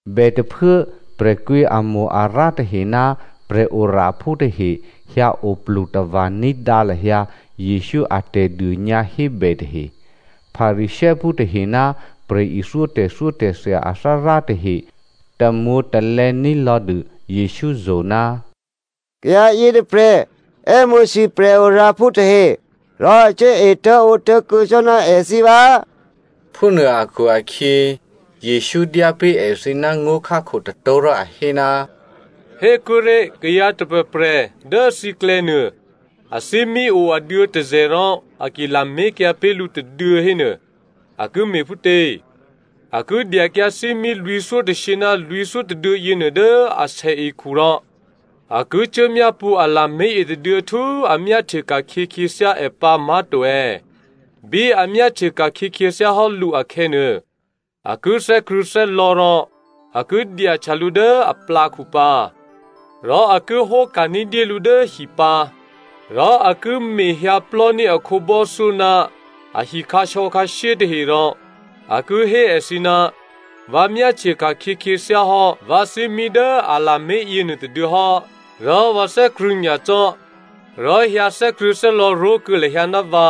Bètôphuố prè̤kwǐamo-arǎ tahe ná prè̤oraphú tahe hyǎ oplu tava̤ ní̤dǎ lahyǎ Jesǔ a tè̤dônyǎhébè tahe. Pharisěophú tahe ná prè̤ithyó tè̤thyótè̤thya athárá tahe tamwǒ̤talè̌ ní̤lò̌dû Jesǔ zo̤, “Kayǎ yětôprè̤ è́mo̤sû prè̤oraphú tahe, rò a cuố etố̤ǒtố̤kuô̌ cò́ ná èthǐ vǎ꤮!” Phúnuô akhu-akhyě, Jesǔ dyá pé̤ èthǐ ná ngó̤khákho tôtó̤ rò a hé, “Hékuốré̤ kayǎ tôprè̤prè̤ dố thǐklè̌nuô, athímí o aduô̌ tôzè̤ rò a ki lamé̤kyǎ pé̤ lǔ tôduô̌ hénuô, a ki me̤phútě? A ki dyakyǎ thímí lwǐ̤thyótôshyě ná lwǐ̤thyó tôduô̌ yěnuô dố asèekhu rò a ki cuốmyápṳ̌ a lamé̤ yětôduô̌ htú a myáhtye ka̤khyě khyěthyá è pǎ má̤to è̌? Bí a myáhtye ka̤khyě khyěthyá hò́ lǔ akhè̌nuô, a ki thè́krṳ̂̌thè́lò̌ rò a ki dyahtya lǔ dố aplǎkhu pǎ. Rò a ki hóka̤ ní̤dyé lǔ dố hi pǎ. Rò a ki mehyǎ plò́ní̤ a khǒbò́thyó ná ahi khǎsò̌khǎshyé tahe rò a ki hé èthǐ, ‘Vǎ myáhtye ka̤khyě khyěthyá hò́ vǎ thímí dố a lamé̤ yěnuô tôduô̌ hò́, rò vǎ thè́krṳ̂̌ nyacò́, rò hyǎ thè́krṳ̂̌thè́lò̌ ró̤kuô̌ lahyǎ ná vǎ.’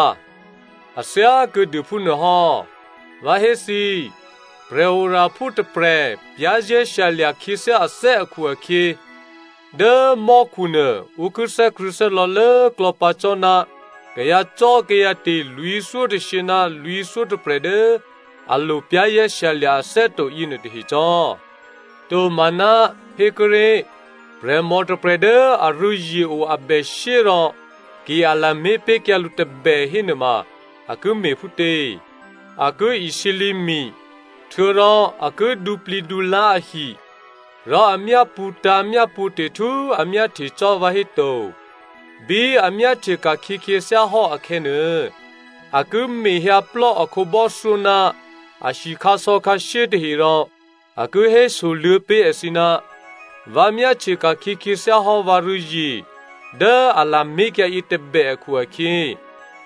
A thyá kuô̌dû phúnuôhò́, vǎ hé thǐ, prè̤oraphú tôprè̤ za̤ ní̤dû khyěthyá hò́ ané̤ akhu-akhyě dố mò́khunuô ǔ ki thè́krṳ̂̌thè́lò̌ lốklò̌ pǎ cò́ ná kayǎcò́kayǎte̤ lwǐ̤thyótôshyě ná lwǐ̤thyótôprè̤ dố a lo za̤ ní̤dû ané̤ hò́ to yěnuô tahe cò́. “Tomaná, hékuốré̤ prè̤mò tôprè̤ dố arû̌zye o abèshyé rò ki a lamé̤ pé̤kyǎ lǔ tôbè hénuôma a ki me̤phútě? A ki isǐlǐ mi, htuô̌rò a ki dǔplǐdǔlá̤ ahi, rò a myápṳ̌tǎ̤ myápṳ̌te̤ htú a myáhtye cò́ vǎhéto. Bí a myáhtye ka̤khyě khyěthyá hò́ akhè̌nuô, a ki mehyǎplò́ a khǒbò́thyó ná ahi khǎsò̌khǎshyé tahe rò a ki hésoluô̌ pé̤ èthǐ, ‘Vǎ myáhtye ka̤khyě khyěthyá hò́ vǎrû̌zye dố a lamé̤kyǎ yětôbè akhu-akhyě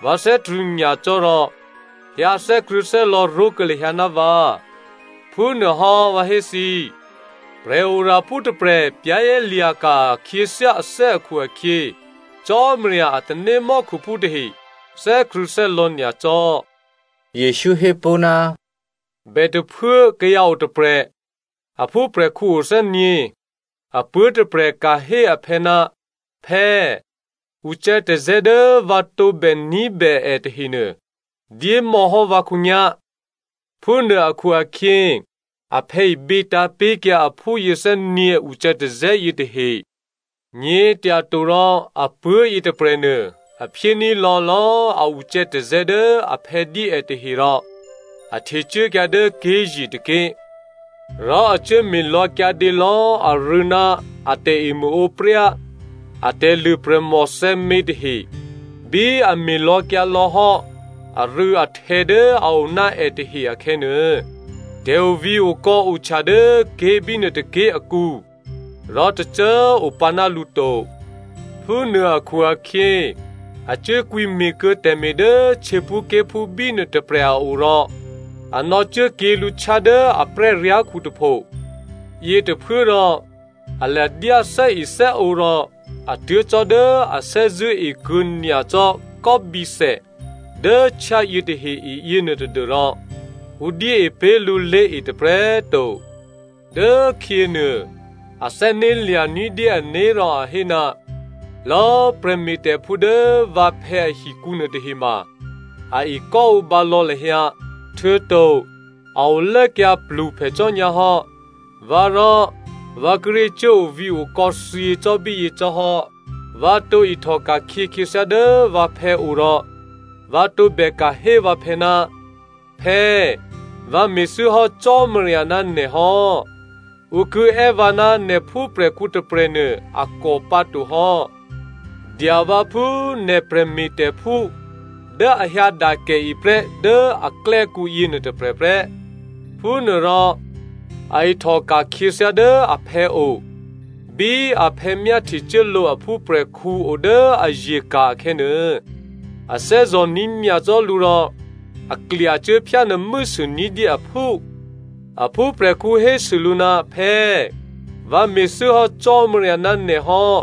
vǎ thè́krṳ̂̌ nyacò́ rò hyǎ thè́krṳ̂̌thè́lò̌ ró̤kuô̌ lahyǎ ná vǎ.’ Phúnuôhò́, vǎ hé thǐ꤮, prè̤oraphú tôprè̤ za̤ ní̤ hò́ akhu-akhyě, Cò́marya a tanémò́khuphú tahe thè́krṳ̂̌thè́lò̌ nyacò́.” Jesǔ hé pó̤, “Bètôphuố kayǎ otôprè̤, a phúprè̤khǔ o thè́nyě̤. Apuố̤ tôprè̤ ka̤ hé aphè̌, ‘Phè̌꤮ ucè̌tazè̌ dố vǎ tǒbè ní̤bè è tahenuô, dyémò̌hò́ vǎ khǒnyá̤.’ Phúnuô akhu-akhyě aphè̌ ibětǎ̤ pé̤kyǎ aphú yěthè́nyě̤ ucè̌tazè̌ yětahe. “Nyě̤tyato rò apuố̤ yětôprè̤nuô, a phyéní̤ lò̌lò̌꤮ a ucè̌tazè̌ dố aphè̌ dyé è yětahe rò a htecuốkyǎ dố ké̤ye̤ tôké̤. Rò a cuố me̤lò̌kyǎdě lò̌ arû̌ ná a tè̤emṳ̂ǒpryá, atè̤lṳ̂ prè̤mòthè̌mě tahe. Bí a me̤ lò̌kyǎ lò̌ hò́ arû̌ahtè̌ dố a o ná è tahe akhè̌nuô, tè̤ovǐ̤okò̌ ohtya dố ké̤ bínuôtôké̤ akǔ, rò tôcô꤮ opǎ ná lǔ to. Phúnuô akhu-akhyě a cuốkwǐ me̤kuô̌ tè̤me̤ dố htyěphúké̤phú bínuô tôprè̤ a o rò a nò̌cuốkyě lǔ htyá dố a prè́lyá̤khu tôpho. Yětôphuốrò a ladyá thè́ethè́ǒ rò a tuố̤ cò́ dố a thè́zṳ̂́ e kuô̌ nyacò́ kò́bǐthè dố htyá yětahe e yěnuô tadû́rò ǔ dyée pé̤ lǔ lé̤e tôprè̤꤮ to. “Dốkhyěnuô, a thè́né̤lya̤ ní̤dyé ané̤ rò a hé, ‘Lò̌꤮ prè̤me̤tè̤phú dố vǎphè̌ ahikǔ nuôtahema, a ekò́ǒbǎ lò̌ lahyǎ, htuô̌to a olốkyǎ pluphè cò́ nyǎ hò́, vǎ rò vǎ kíré̤ cuố ovǐ̤okò̌ thyě cò́ bíyě cò́ hò́. Vǎ tǒ ihtò ka̤khyě khyěthyá dố vǎphè̌ o rò vǎ tǒbè ka̤ hé vǎphè̌, “Phè̌꤮ vǎ me̤thû́hò́ Cò́marya ná nè̤ hò́. Ǔ ki è́ vǎ ná nè̤ phúprè̤khǔ tôprè̤nuô a kò pǎ to hò́. Dya vǎ phú nè̤ prè̤me̤tè̤phú dố a hyǎdakèe prè́ dố aklè́kǔ yěnuô tôprè̤ prè́.”’ Phúnuôrò a ihtòka̤ khyěthyá dố aphè̌ o. “Bí aphè̌ myáhtyecuốlǒ a phúprè̤khǔ o dố aye̤ ka̤ akhè̌nuô, a thè́zò̤ní̤ nyacò́ lǔ rò a klyacuố phyánuô̤mû́sû ní̤dyé aphú. “Aphúprè̤khǔ hésû lǔ, ‘Phè̌꤮ vǎ me̤thû́hò́ Cò́marya ná nè̤ hò́,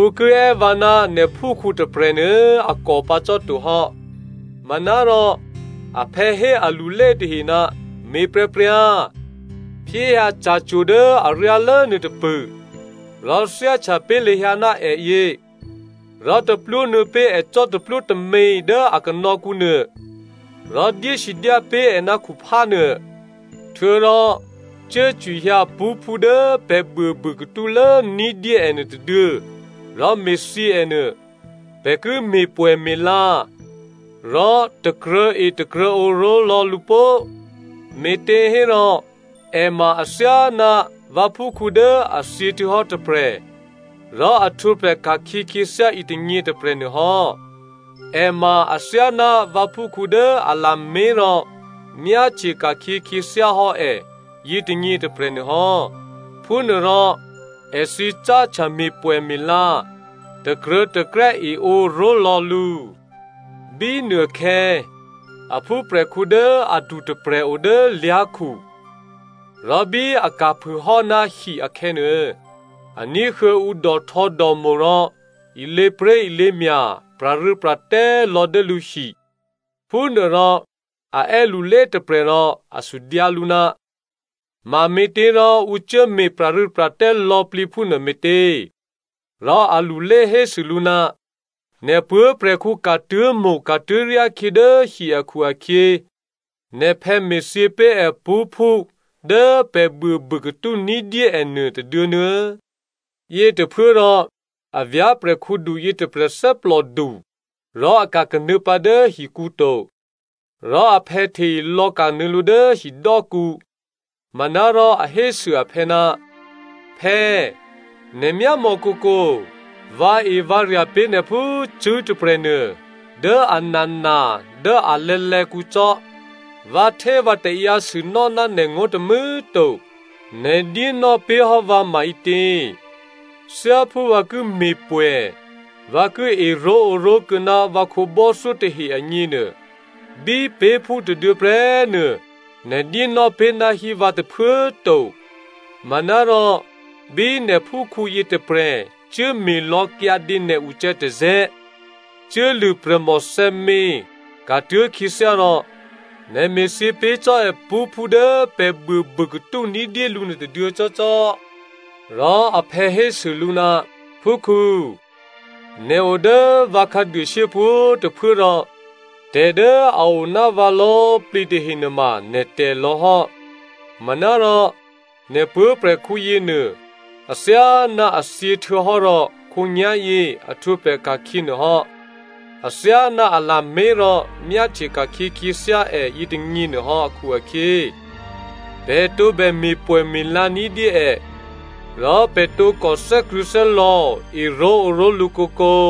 ǔ ki è́ vǎ ná nè̤phúkhǔ tôprè̤ nuô̌꤮ a kò pǎ cò́ to hò́.’ “Manárò aphè̌ hé alulé tahe, ‘Me̤pryǎpryǎ, phyéhyǎ ca̤cwo̤ dố aryálố nuôtôpṳ̂, rò thyáhtya pé̤ lahyǎ ná è yě, rò taplwó nuô̌ pé̤ è cò́taplwó tômě dố a kanò̌kǔnuô, rò dyé sidyá pé̤ è khuphá nuô. Htuô̌rò cuốcwihyǎ pṳ́phú dố pè̤ buôbû katúlố ní̤dyé è nuôtôduô̌ rò me̤thyě è nuô. Pè̤ ki me̤pwè̌me̤la, rò takruô̤̌etakruô̤̌ǒ ró̤lò̌ lǔ pó꤮. Me̤těhérò è ma athyáná vǎphúkhǔ dố a thyěhtuô̌hò́ tôprè̤, rò a htwǒprè̤ ka̤khyě khyěthyá yětônyě tôprè̤nuô hò́. È ma athyáná vǎphúkhǔ dố a lamé̤ rò myáhtye ka̤khyě khyěthyá hò́ è yětônyě tôprè̤ nuôhò́.’ Phúnuôrò èthǐ cáhtya me̤pwè̌me̤la, takruô̤̌takrè́ eǒ ró̤lò̌ lǔ. “Bínuôkhè̌ a phúprè̤khǔ dố adu tôprè̤ o dố lyá̤khu. Rò bí a ka̤phûhò́ ná hi akhè̌nuô, a ní̤huô̌ ǔ dòhtò̌dòmo̤ rò ilěpré̤ilěmya̤ pra̤rû́pra̤tè́ lò̌ dố lǔhi. Phúnuôrò a è́ lulé tôprè̤ rò a sudyǎ lǔ, ‘Mame̤těrò ǔ cuốme̤ pra̤rû́pra̤tè́ lò̌plǐ phúnuô me̤tě?’ Rò alulé hésû lǔ, ‘Nè̤ puố̤prè̤khǔ ka̤tuố̤mo̤ ka̤tuố̤ryá khyě dố hi akhu-akhyě, nè̤phè̌ me̤thyě pé̤ è pṳ́phú dố pè̤ buôbûkatú ní̤dyé è nuô tôduô̌ nuô̌꤮.’ “Yětôphuốrò a vyá̤prè̤khǔdu yětôprè̤ thè́plòdu rò a ka̤kanuô̌ pǎ dố hikǔ to. Rò aphè̌ hte ilò̌kanuô̌ lǔ dố hidò́kǔ. Manárò a hésû aphè̌, ‘Phè̌꤮ nè̤ myámò̌ kǒkǒ, vǎevǎrya̤ pé̤ nè̤ phú cṳ̂́ tôprè̤nuô dố anana dố alè̌lè̌kǔ cò́, vǎhtévǎtaǎyǎ sûnò́ ná nè̤ngó̤ tômû̌꤮ to. Nè̤ dyénò́ pé̤ hò́ vǎ maǐtě? Thyáphú vǎ ki me̤pwè̌, vǎ ki eró̤ǒró̤ kuô̌ ná vǎ khǒbò́thyó tahe agněnuô, bí pé̤phú tôduô̌ prè́꤮ nuô nè̤ dyé nò́ pé̤náhí vǎ tôphuố꤮ to. Manárò bí nè̤phúkhǔ yětôprè̤ cuố me̤lò̌ kyǎdě nè̤ ucè̌tazè̌, cuốlṳ̂ prè̤mòthè̌mě ka̤tuố̤ khyěthyá rò, nè̤ me̤thyě pé̤ cò́ è pṳ́phú dố pè̤ buôbûkatú ní̤dyé lǔ nuôtôduô̌ cò́cò́!’ “Rò aphè̌ hésû lǔ, ‘Phúkhǔ꤮, nè̤ o dố vǎ khǎduôshyé pwǒ̤꤮ tôphuố rò tè̤ dố a o ná vǎ lò̌꤮ plǐ tahe nuôma nè̤tè̤ lò̌ hò́. Manárò nè̤ puố̤prè̤khǔ yěnuô athyáná a thyěhtuô̌hò́ rò khǒnyá̤yě a htwǒprè̤ ka̤khyě nuôhò́, athyáná a lamé̤ rò myáhtye ka̤khyě khyěthyá è yětônyě nuôhò́ akhu-akhyě, pè̤ tǒbè me̤pwè̌me̤la ní̤dyé è, rò pè̤ tǒkò thè́krṳ̂̌thè́lò̌ eró̤ǒró̤lǔ kǒkǒ.’”